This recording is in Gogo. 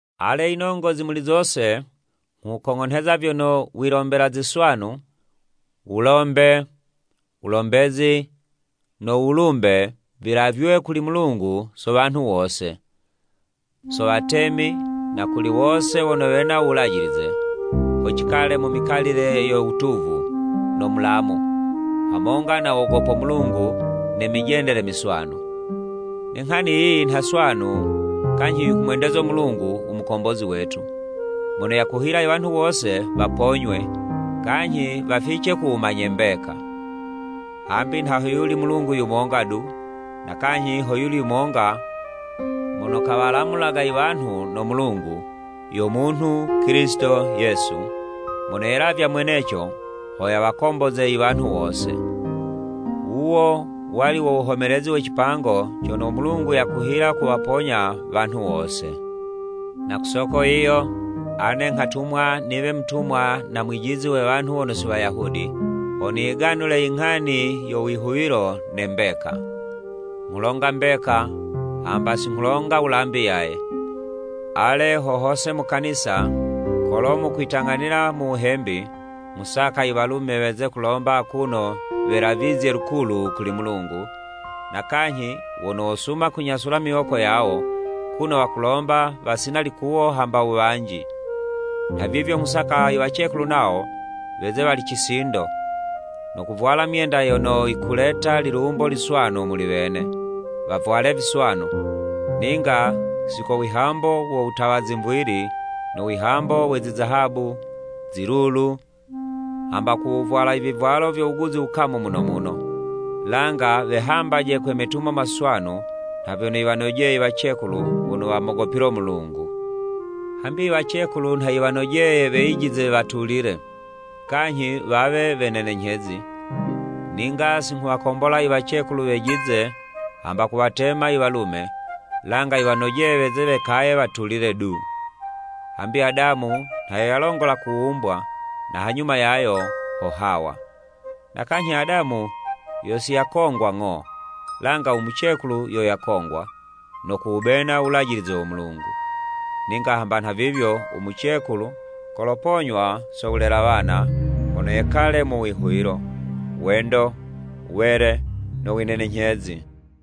Ale, yinongozi muli zose, nghukong'onheza vyono wilombela ziswanu, wolombe, wulombezi, no wulumbe, vilavywe kuli Mulungu so wanhu wose, so watemi na kuli wose wono wena u wulajilize, ho cikale mu mikalile yo wutuvu no mulamu, hamonga no wogopo Mulungu ne mijendele miswanu. Ne nghani yiyi nha swanu kanyhi yikumwendezo Mulungu u Mukombozi wetu, mono yakuhila i wanhu wose waponywe, kanyhi wafice ku wumanye mbeka. Hambi nha hoyuli Mulungu yumonga du, na kanyhi hoyuli yumonga mono kawalamulaga iwanhu no Mulungu, yo munhu, Kilisito Yesu, mono yelavya mweneco ho yawakomboze iwanhu wose. Wuwo wali wo wuhomelezi we cipango cono u Mulungu yakuhila kuwaponya wanhu wose. Na ku soko yiyo, ane nghatumwa niwe mutumwa na mwijizi we wanhu wono si Wayuda, ho niyiganule i nghani yo wihuwilo ne mbeka. Nghulonga mbeka, hamba singhulonga wulambi yaye! Ale, ho hose mu kanisa, kolo mukwitang'anila mu wuhembi, nghusaka iwalume weze kulomba akuno welavizye lukulu kuli Mulungu, na kanyhi wono wosuma kunyasula imiwoko yawo, kuno wakulomba wasina likuwo hamba wuwanji. Nhavivyo, nghusaka iwacekulu nawo, weze wali cisindo, no kuvwala myenda yono yikuleta lilumbo liswanu muli wene, wavwale viswanu, ninga si ko wihambo wo wutawa zimvili, no wihambo we zizahabu, zilulu, hamba ku wuvwala ivivwalo vyo wuguzi wukamu muno muno, langa wehambaje kwe metumo maswanu nha vyono yiwanojeye i wacekulu wono wamogopilo Mulungu. Hambi iwacekulu nha yiwanojeye weyijize watulile, kanyhi wawe wenenenyhezi. Ninga singhuwakombola iwacekulu wejize hamba kuwatema i walume, langa yiwanojeye weze wekaye watulile du. Hambi Adamu nha yo yalongola kuwumbwa, na hanyuma yayo, ho Hawa. Na kanyhi, Adamu yo si yakongwa ng'o, langa u mucekulu yo yakongwa, no kuwubena u Wulajilize wo Mulungu. Ninga hamba nhavivyo umucekulu koloponywa so wulela wana, hono yekale mu wihuwilo, wendo, wele, no winenenyhezi.